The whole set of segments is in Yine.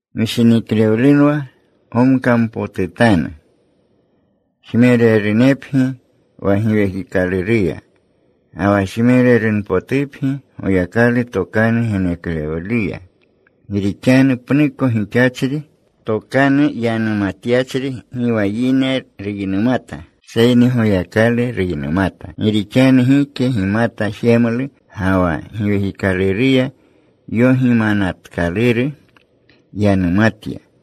Gishiniklewlu gomkampotutanu. Jmererunepgi wa Giwekikalurunuya, ga wa jmererunpotupgi Goyakalu tokanu geneklewluya. Gi rixanu pnuko gixachri tokanu yanumatyachri gi wa yine ruynumata, seyni Goyakalu ruynumata. Gi rixanu gike gimata jemlu. Ga wa giwekikaluruya yogimanatkaluru yanumatya.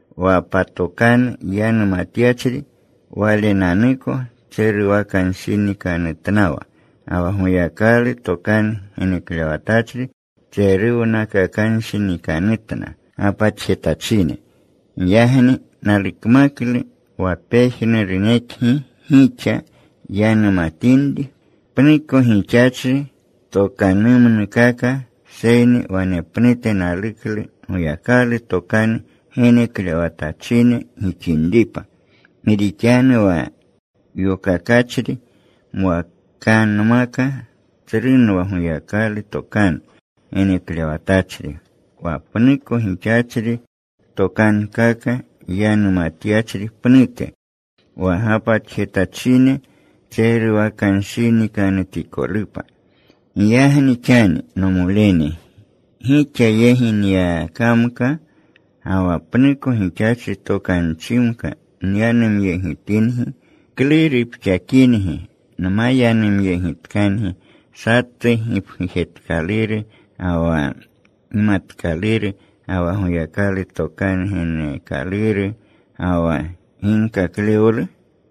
Wa patokanu yanumatyachri walenanuko tseruwakanshinikanutnawa. Ga wa Goyakalu tokanu geneklewatachri tseruwakanshinikanutna gapatjetachine. Giyagni nalukmaklu wa pejnurunekgi gixa yanumatinri pnuko gixachri tokanumnukaka. Seyni wanepnute naluklu Goyakalu tokanu geneklewatachine gixinripa. Gi rixanu wa yokakachri mwakanmaka tsrunwa Goyakalu tokanu geneklewatachri wa pnuko gixachri tokankaka yanumatyachri pnute, wa gapatjetachine tseruwakanshinikanutikolupa. Giyagni xani, nomolene, gixa yegi nyakamka ga wa pnuko gixachri tokanchimka nyanumyegitingi, ¿klu rupxakingi nma yanumyegitkangi satu gipgujetkaluru, ga wa gimatkaluru, ga wa Goyakalu tokanu geneekaluru, ga wa ginkaklewlu?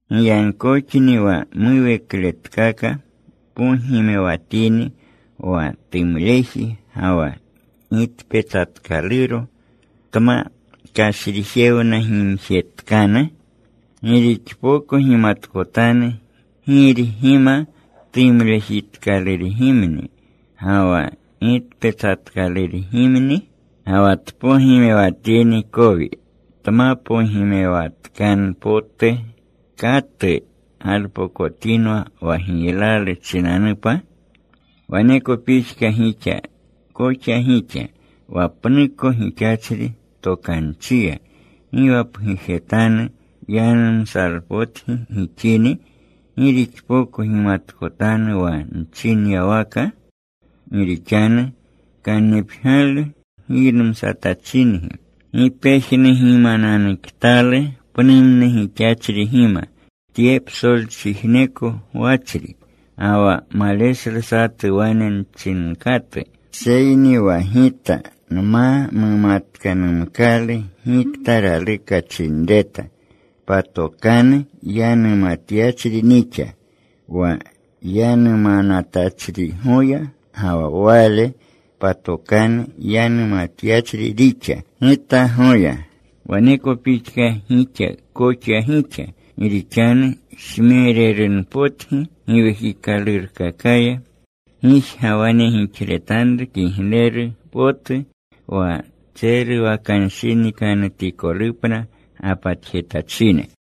Giyagkoxni wa muwekletkaka pogimewatini wa tumleji ga wa gitpetsatkaluro, tma kashrijewnagimjetkanu ¿gi rixpoko gimatkotanu girgima tumlejitkalurgimni ga wa gitpetsatkalurgimni? Ga wa tpogimewatini kowi tma pogimewatkanu potu ¿katu galpokotinwa wa giylalu chinanupa? Waneko pixka gixa koxa gixa. Wa pnuko gixachri tokanchiya gi wa pgujetanu yanumsalpotgi gixini, ¿gi rixpoko gimatkotanu wa nchinyawaka? Gi rixanu kannipgyalu giynumsatachingi. ¡Gi pejnugimananuktalu pnumnu gixachrigima tye psolchijneko gwachri! Ga wa maleshlu satu wane mchinkatu. Seyni wa gita nma mumatkanumkalu gikta raluka chinreta, patokanu yanumatyachri nixa wa yanumanatachrigoya, ga wa wale patokanu yanumatyachri rixa gitagoya. Waneko pixka gixa koxa gixa. Gi rixanu jmererunpotgi Giwekikalurunkakaya, gijga wane gixletanru kigleru potu wa tseruwakanshinikanutikolupna gapatjetachine.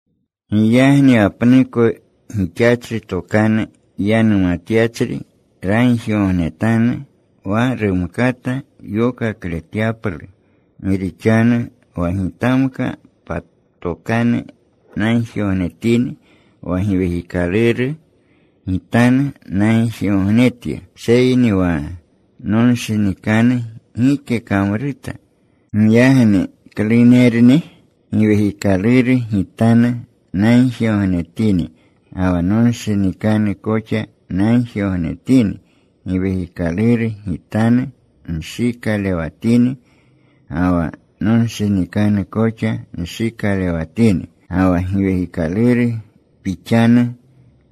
Giyagni wa pnuko gixachri tokanu yanumatyachri ragjigognetanu wa rumkata yokakletyaplu. Gi rixanu wa gitamka patokanu nagjigognetini, wa giwekikaluru gitanu nagjigognetya, seyni wa nonshinikanu gike kamruta. Giyagni ¿klunerni? Giwekikaluru gitanu nagjigognetini, ga wa nonshinikanu koxa nagjigognetini. Giwekikaluru gitanu nshikalewatini, ga wa nonshinikanu koxa nshikalewatini. Ga wa giwekikaluru pixanu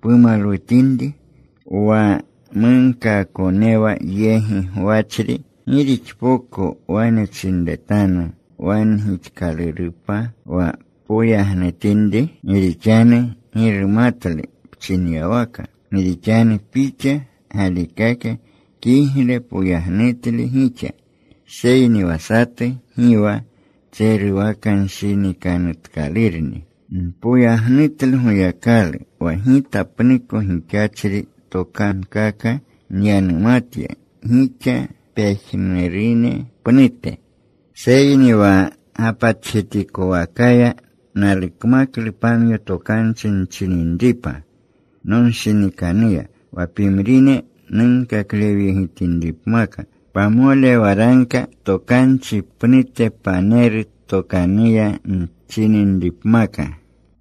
pumalwutinri, wa munkaakonewa yegi gwachri ¿gi rixpoko wane chinretanu, “Wane gixkalurupa,” wa poyagnutinri? Gi rixanu gi rumatlu pchinyawaka. Gi rixanu pixa galikaka kigle poyagnutle gixa, seyni wa satu gi wa tseruwakanshinikanutkalurni. Npoyagnutlu Goyakalu wa gita pnuko gixachri tokankaka nyanumatya gixa pejnurune pnute. Seyni wa gapatjetikowakaya nalukmaklu pamyo tokanchi nchininripa nonshinikannuya wa pimrine nunkaklewyegitinripmaka, pamole waragka tokanchi pnute paneru tokanuya nchininripmaka.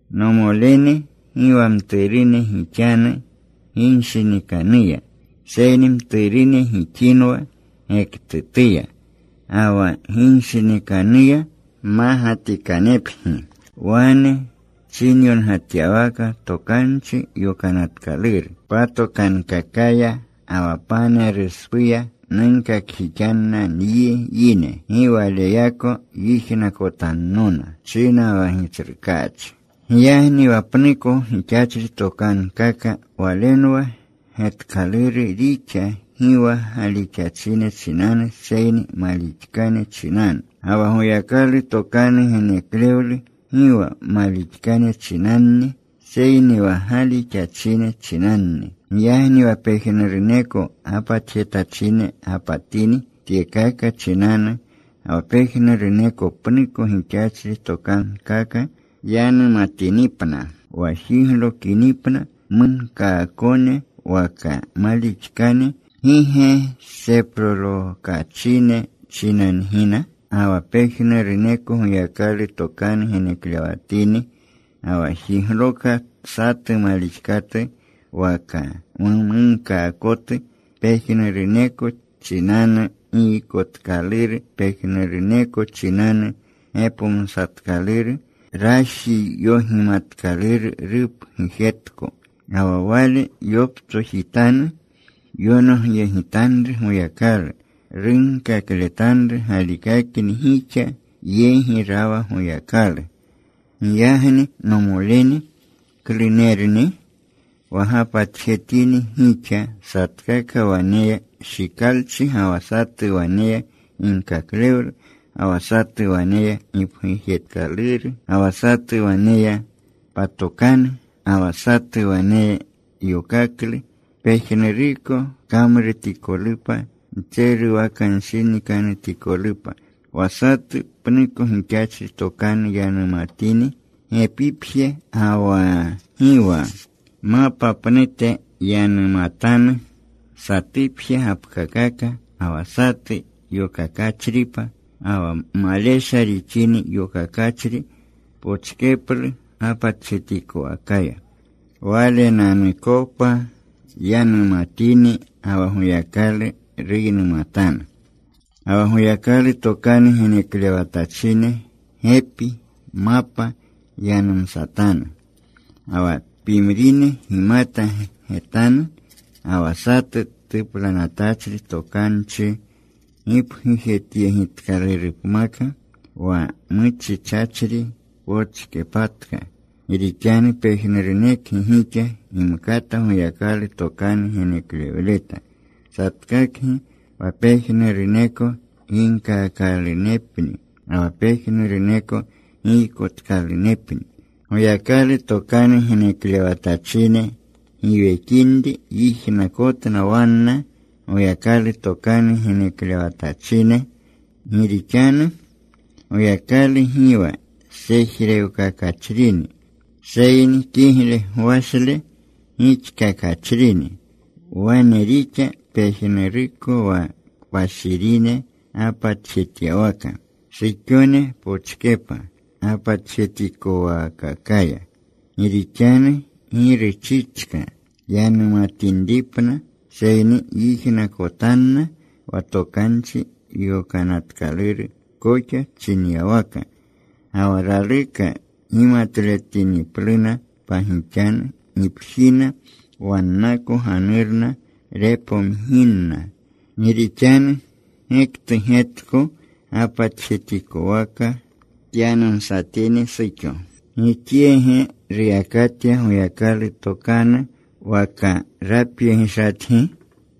Nomolene, gi wa mturune gixanu ginshinikanuya, seyni mturune gixinwa gektutuya. Ga wa ginshinikanuya mmagatikanepgi. Wane chinyongatyawaka Tokanchi Yokanatkaluru: Patokankakaya ga wa paneruspuya, Nunkakjixinna nyi yine. Gi waleyako yijnakotannona, China wa Gitsrukaachi. Giyagni wa pnuko gixachri tokankaka walenwa getkaluru rixa gi wa galixachine chinanu seyni malixkane chinanu. Ga wa Goyakalu tokanu geneklewlu gi wa malixkane chinanni, seyni wa galixachine chinanni. Giyagni wa pejnuruneko gapatjetachine gapatini tyekaka chinanu, ga wa pejnuruneko pnuko gixachri tokankaka yanumatinipna, wa jiglokinipna munkaakone waka malixkane, ¿gi ge seprolokachine chinangina? Ga wa pejnuruneko Goyakalu tokanu geneklewatini, ga wa jigloka satu malixkatu waka munkaakotu, pejnuruneko chinanu giykotkaluru. Pejnuruneko chinanu gepomsatkaluru. Raji yogimatkaluru rupgujetko. Ga wa wale yoptsojitanu, yonogyegitanru Goyakalu. Runkakletanru galikakni gixa yegi rawa Goyakalu. Giyagni, nomolene, ¿klunerni? Wa gapatjetini gixa, satkaka waneya shikalchi. Ga wa satu waneya ginkaklewlu. Ga wa satu waneya gipgujetkaluru. Ga wa satu waneya patokanu. Ga wa satu waneya yokaklu. Pejnuruko kamrutikolupa ntseruwakanshinikanutikolupa. Wa satu pnuko gixachri tokanu yanumatini, gepipje ga wa gi wa mapa pnute yanumatanu. Satupje gapkakaka. Ga wa satu yokakachripa. Ga wa malesha rixini yokakachri pochkeplu gapatjetikowakaya. Walenanukopa yanumatini, ga wa Goyakalu ruynumatanu. Ga wa Goyakalu tokanu geneklewatachine gepi, mapa yanumsatanu. Ga wa pimrine gimata getanu. Ga wa satu tuplanatachri tokanchi gipgujetyegitkalurupmaka, wa muchichachri pochkepatka. Gi rixanu pejnurunekgi gixa gimkata Goyakalu tokanu geneklewleta, satkakgi, wa pejnuruneko ginkaakalunepni, ga wa pejnuruneko giykotkalunepni. Goyakalu tokanu geneklewatachine giwekinri yijnakotna wanna Goyakalu tokanu geneklewatachine. Gi rixanu Goyakalu gi wa sejrewkakachrini, seyni kigle gwashle gixkakachrini. Wane rixa pejnuruko wa kpashirine gapatjetyawaka. Suxone pochkepa gapatjetikowaakakaya. Gi rixanu gi ruchichka yanumatinripna, seyni yijnakotanna, wa Tokanchi Yokanatkaluru koxa chinyawaka. Ga wa raluka gimatletinipluna pagixanu, gipjina wannako ganurna repomginna. Gi rixanu gektu getko gapatjetikowaka tyanumsatini suxo. ¿Gixyeege ruyakatya Goyakalu tokanu, waka rapyegishatgi?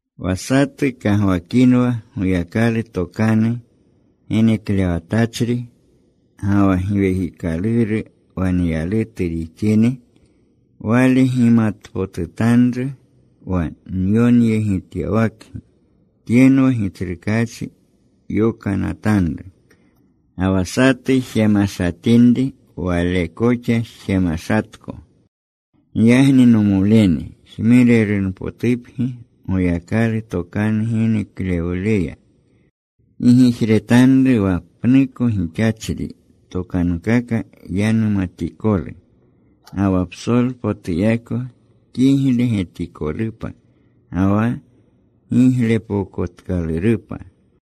Wa satu kagwakinwa Goyakalu tokanu geneklewatachri ga wa Giwekikaluru waneyalutu rixini, wale gimatpotutanru wa nyonyegityawakgi tyenwa Gitsrukaachi yokanatanru. Ga wa satu jemashatinri, wale koxa jemashatko. Giyagni, nomolene, jmererunpotupgi Goyakalu tokanu geneklewluya. Gi gijretanru wa pnuko gixachri tokankaka yanumatikolu. Ga wa psolpotuyako kigle getikolupa, ga wa giglepokotkalurupa.